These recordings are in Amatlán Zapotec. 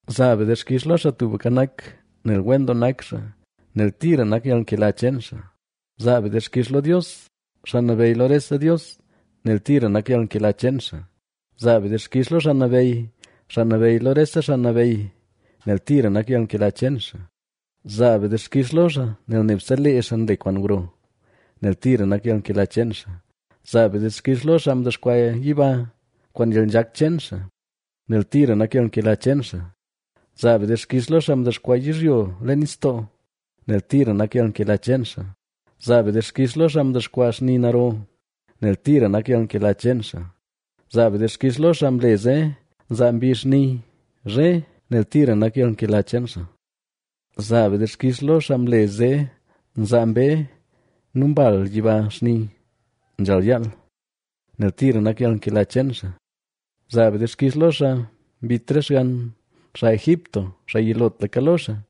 Zaa be dixkix lo Xaa Tubka Nak, nel wen doo nak xaa, nel tira nak yalnkela cheen xaa. Zaa be dixkix lo Dios, xaa nabeyy lo rese dios, nel tira nak yalnkela cheen xaa. Zaa be dixkix lo Xaa Nabeyy xaa nabeyy lo rese xaa nabeyy, nel tira nak yalnkela cheen xaa. Zaa be dixkix lo xaa nel nebse lee xaa nle kwaan gro, nel tira nak yalnkela cheen xaa. Zaa be dixkix lo xaa mdexkwaa yiba kwaan yalnzhak cheen xaa, nel tira nak yalnkela cheen xaa. Zaa be dixkix lo xaa mdexkwaa yizhyo leen nistoo, nel tira nak yalnkela cheen xaa. Zaa be dixkix lo xaa mdexkwaa xni naro, nel tira nak yalnkela cheen xaa. Zaa be dixkix lo xaa mle zee nzaa mbizh xni zhe, nel tira nak yalnkela cheen xaa. Zaa be dixkix lo xaa mle zee nzaa mbee nu mbal yiba xni nzhal yaal, nel tira nak yalnkela cheen xaa. Zaa be dixkix lo xaa mbit re xgann xaa Egipto, xaa yilotlaka lo xaa,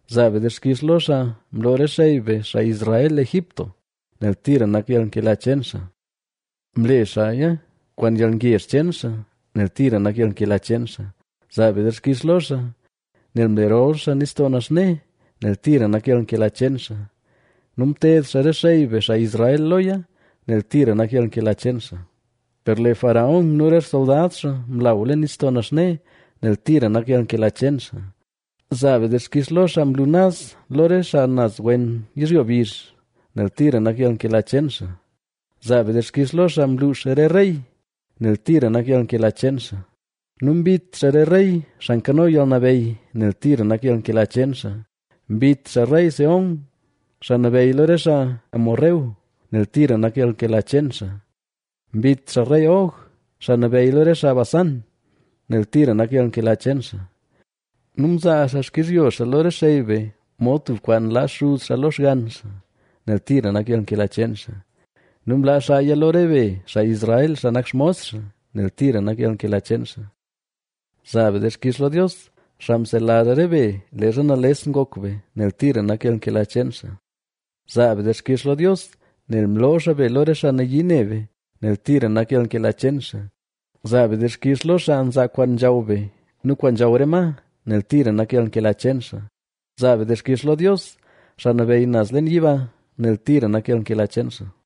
Zaa be dixkix lo xaa mloo re xey be xaa Israel Egipto, nel tira nak yalnkela cheen xaa. Mle xaaya kwaan yalngezh cheen xaa, nel tira nak yalnkela cheen xaa. Zaa be dixkix lo xaa, nel mle rol xaa Nistoo Naxne, nel tira nak yalnkela cheen xaa. Nu mted xaa re xey be xaa Israel loya, nel tira nak yalnkela cheen xaa. Per lee Faraón nu re xsoldad xaa mlaw leen Nistoo Naxne, nel tira nak yalnkela cheen xaa. Zaa be dixkix lo xaa mlu naz lo re xaa naz wen yizhyo bizh, nel tira nak yalnkela cheen xaa. Zaa be dixkix lo xaa mluux re rey, nel tira nak yalnkela cheen xaa. Nu mbit xaa re rey xaa nkano yalnabeyy, nel tira nak yalnkela cheen xaa. Mbit xaa rey Sehón, xaa nabeyy lo re xaa Aram, nel tira nak yalnkela cheen xaa. Mbit xaa rey Og, xaa nabeyy lo re xaa Basán, nel tira nak yalnkela cheen xaa. Nu mzaa xaa xkizhyo xaa lo re xey be mod tub kwaan laa xuz xaa lo xgann xaa, nel tira nak yalnkela cheen xaa. Nu mlaa xaaya lo re be, xaa Israel xaa nak xmos xaa, nel tira nak yalnkela cheen xaa. Zaa be dixkix lo Dios, xaa mselazh re be leezha nales ngok be, nel tira nak yalnkela cheen xaa. Zaa be dixkix lo Dios nel mloo xaa be lo re xaa nayii ne be, nel tira nak yalnkela cheen xaa. Zaa be dixkix lo xaa nzaa kwaan nzhaw be nu kwaan nzhaw re ma, nel tira nak yalnkela cheen xaa. Zaa be dixkix lo Dios, xaa nabeyy naz leen yiba, nel tira nak yalnkela cheen xaa.